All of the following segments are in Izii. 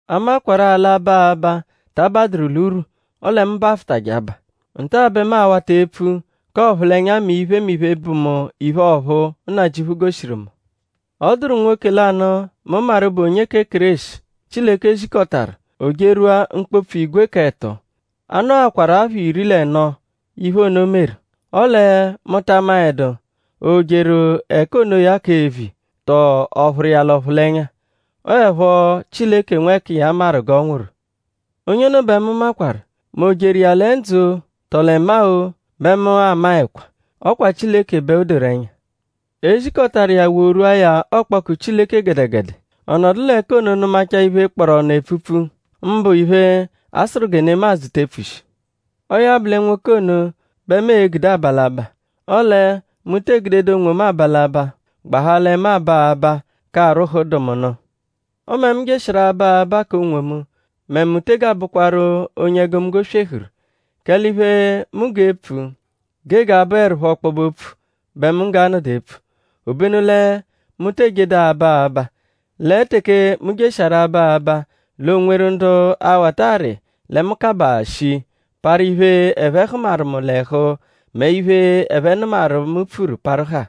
A makwarụ-a l'aba aba ta abadụru l'urwu; ọle mu bafụtaje aba. Nta-a bẹ mu a-wata epfu k'ọphulenya mẹ iphemiphe, bụ mu iphe ọ̀phúú, Nnajịuphu goshiru mu. Ọ dụru nwoke lanụ, mu maru bụ onye kẹ Kéreshi, Chileke zikọtaru; o jerwua mkpopfu igwe k'ẹto. A nọakwaru apha iri l'ẹno, iphe ono meru. Ọle mu ta maẹdu?o jeru ẹka onoya k'eviya; tọ ọ phụru iya l'ọphulenya? Ọo 'ẹpho Chileke nwẹkiya maru g'ọ nwụru. Onye ono bẹ mu makwarụ; mẹ o jeru iya lẹ ndzụ-o; tọo lẹ maa-o; bẹ mu amaẹkwa; ọ kwa Chileke bẹ o doru ẹnya. E zikọtaru iya worwua ya ọkpoku Chileke gẹdegede. Ọ nọdu l'ẹka ono nụmachaa iphe, kpọru ọnu epfupfu; mbụ iphe, a sụru gẹ nemadzụ te epfushi. Ọo ya bụ lẹ nwoke ono bẹ mu e-gude aba l'abaa. Ọle mu tee gudedu onwomu aba l'abaa; gbahaa lẹ mu aba abaa k'arwụhu dụ mu nụ. Ọme mu jeshiaru aba abaa k'onwomu mẹ mu tege abụkwaru onye egomunggo swehuru; kẹle iphe, mu g'epfu gege abụerupho ọkpobe-opfu bẹ mu g'anọdu epfu. Obenu lẹ mu te ejedu aba abaa; lẹ teke mu jeshiaru aba abaa l'oo-nweru ndu a-wata arị lẹ mu kabaa shii; parụ iphe, ẹphe hụmaru mu l'ẹhu mẹ iphe, ẹphe nụmaru, mu pfuru parụ haa.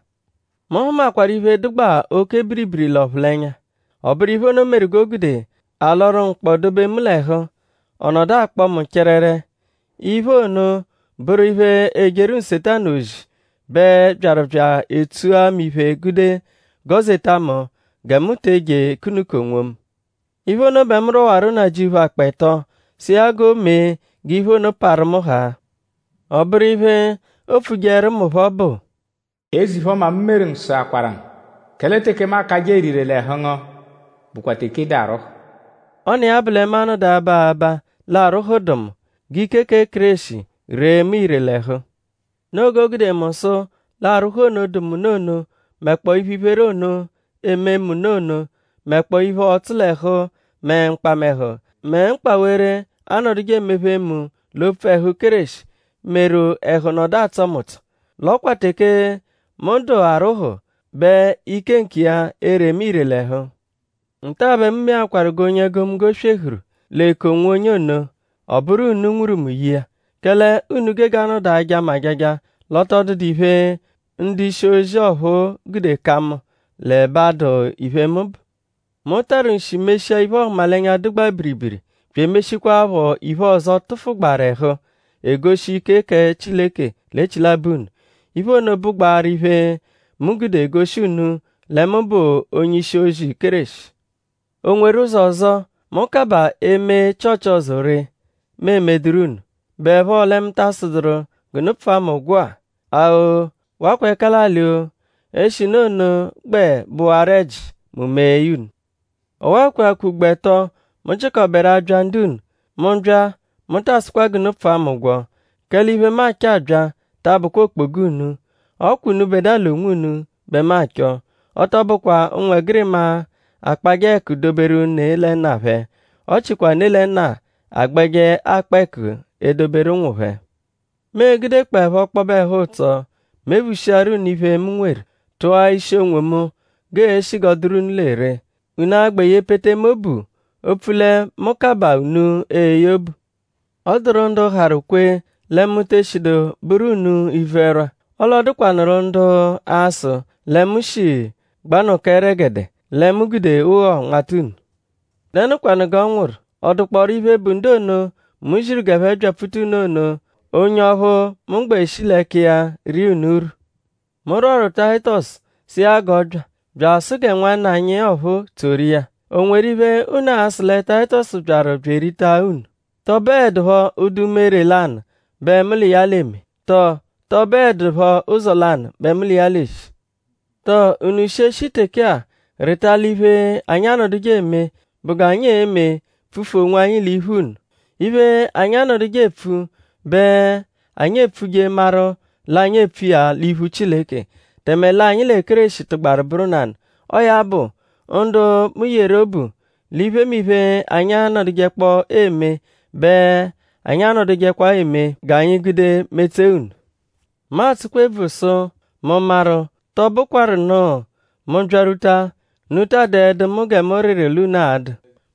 Mu hụmakwaru iphe, dụgbaa oke biribiri l'ọphulenya. Ọ bụru iphe ono meru g'o gude a lọru mkpọ dobe mu l'ẹhu; ọ nọdu akpọ mu chẹrere. Iphe ono bụru iphe, ejeru Nsetanu ozi bẹ byaru bya etsua mu iphe gude gọ-zeta mu gẹ mu te eje ekunuka onwomu. Iphe ono bẹ mu rwọwaru Nnajịuphu akpọ ẹto sụ iya g'o mee g'iphe ono parụ mu haa. Ọ bụru iphe, o epfujeẹru mu phọ bụ: “Eze-iphe-ọma, mu meru ngu sụakwaru ngu; kẹle teke mu akajẹ ere ire l'ẹhu ngu bụkwa teke ị dụ arwụdu.” Ọ n'iya-a bụ lẹ mu a-nọdu aba abaa l'arwụhu dụ mu; g'ike kẹ Kéreshi ree mu ire l'ẹhu. Noo g'o gude mu sụ l'arwụhu ono, dụ mu nụ ono; mẹkpoo iphe-iphere ono, eeme mu ono; mẹkpoo iphe ọtsu-l'ẹhu; mẹ mkpamẹhu; mẹ mkpawere, aanọduje emephe mu l'opfu ẹhu Kéreshi; meru ẹhu nọdu atsọ mu ụtso. L'ọ kwa teke mu dụ arwụhu bẹ ike nkiya ere mu ire l'ẹhu. Nta-a bẹ mu meakwaru g'onye egomunggo swehuru l'eku-onwonye ono; ọ bụru unu nwuru mu ye iya. Kẹle unu gege anọdu aja mu ajaja; l'ọ tọ dụdu iphe, ndu-ishi-ozi ọphuu gude ka mu; l'ẹbe adụ iphe, mu bụ. Mu tarụ nshi meshia iphe-ọhumalenya, dụgbaa biribiri; bya emeshikwaaphọ iphe ọzo, tụfugbaru ẹhu, egoshi ike kẹ Chileke l'echilabọ unu. Iphe ono bụgbaaru iphe, mu gude goshi unu lẹ mu bụ onye-ishi-ozi Kéreshi. ?O nweru ụzo ọzo, mu kabaa eme Chịochi ọzo ree, mu emeduru unu??Bụepho lẹ mu ta asụduru g'unu pfụa mu ụgwo-a? A-o; wakwa ẹka l'alị-o; eshinu ono gbẹ bụwaru ẹji; mu mee ya unu. Ọwa-a kweakwa ugbo ẹto, mu jịkoberu abya ndu-unu. Mu -bya; mu taa sụkwa g'unu pfụa mu ụgwo; kẹle iphe, mu achọ abya ta abụkwa okpoga unu. Ọ kwa unubẹdua l'onwunu bẹ mu achọ. Ọ tọ bụkwa ụnwegirima akpajẹ ẹku doberu ne lẹ nna phẹ; ọ chikwa ne lẹ nna agbẹje akpa ẹku edoberu ụnwu phẹ. Mu e-gudekpọepho ọkpobe ẹhu-ụtso mephushiaru unu iphe, mu nweru; tụa ishi onwomu g'eeshi g'ọ dụru unu lẹ ree.?Unu a-gbẹ yepete mu obu opfu lẹ mu kabaa unu eye obu? Ọ dụru ndu harụ kwe lẹ mu te eshidu bụru unu ivu-ẹrwa. Ọle ọ dụkwanuru ndu a-sụ lẹ mu shi gbanụka ẹregede; lẹ mu gude ụgho nmata unu. ?Dẹnukwanu g'ọ nwụru??Ọ dụkpooru iphe, bụ ndu ono, mu ziru g'ẹphe byapfuta unu ono onye ọphu mu gbẹ shi l'ẹka iya ria unu urwu? Mu rwọru Tayitọsu sụ iya g'ọ bya; bya asụ gẹ nwanna anyi ọphuu tsoru iya.?O nweru iphe, unu a-sụ lẹ Tayitọsu byaru bya erita unu??Tọ bụedupho ụdu umere lanụ bẹ mu l'iya l'eme; tọo tọ bụedupho ụzo lanụ bẹ mu l'iya l'eshi? ?Tọ unu shi e -shi teke-a rịta l'iphe, anyi anọduje eme bụ g'anyi e-me pfufu onwanyi l'iphu unu? Iphe, anyi anọduje epfu bẹ anyi epfuje maru l'anyi epfu iya l'iphu Chileke; tẹme l'anyi lẹ Kéreshi tụgbaru bụru nanụ. Ọo ya bụ; ndu mu yeru obu; l'iphemiphe, anyi anọdujekpoo eme bẹ anyi anọdujekwa eme g'anyi gude metsee unu. Mu atsụkwa ebvu sụ:?mu maru tọo bụkwaru nụ; mu -byarwuta; unu taa dụedu gẹ mu rịru l'unu a-dụ;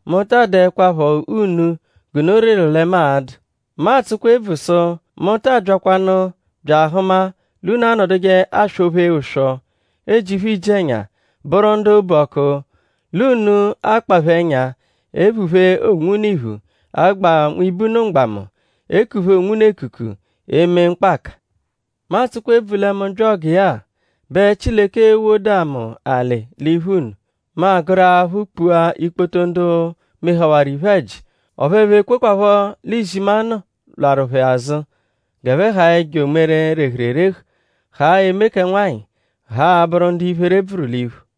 mu taa dụekwapho unu g'unu rịru lẹ mu a-dụ. Mu atsụkwa ebvu sụ:?mu taa byakwanụ bya ahụma l'unu anọduje aswọ-phe ụswo; ejiphe iji-ẹnya; bụru ndu obu ọku; l'unu akpaphe ẹnya; ephuphe onwunu iphu; agba nwibe unu mgbamu; ekuphe onwunu ekuku; eme mkpaka. Mu atsụkwa ebvu lẹ mu -bya ọgiya-a, bẹ Chileke ewoda mu alị l'iphu unu; mu agụru aphụ kpua ikpoto ndu mehawaru iphe-ẹji; ọphu ẹphe ekwekwaphọ l'izimanụ lwarụ phẹ azụ g'ẹphe haa ẹjo umere, rehuru erehu; haa eme kẹ nwanyị; haa abụru ndu iphere bvụru l'iphu.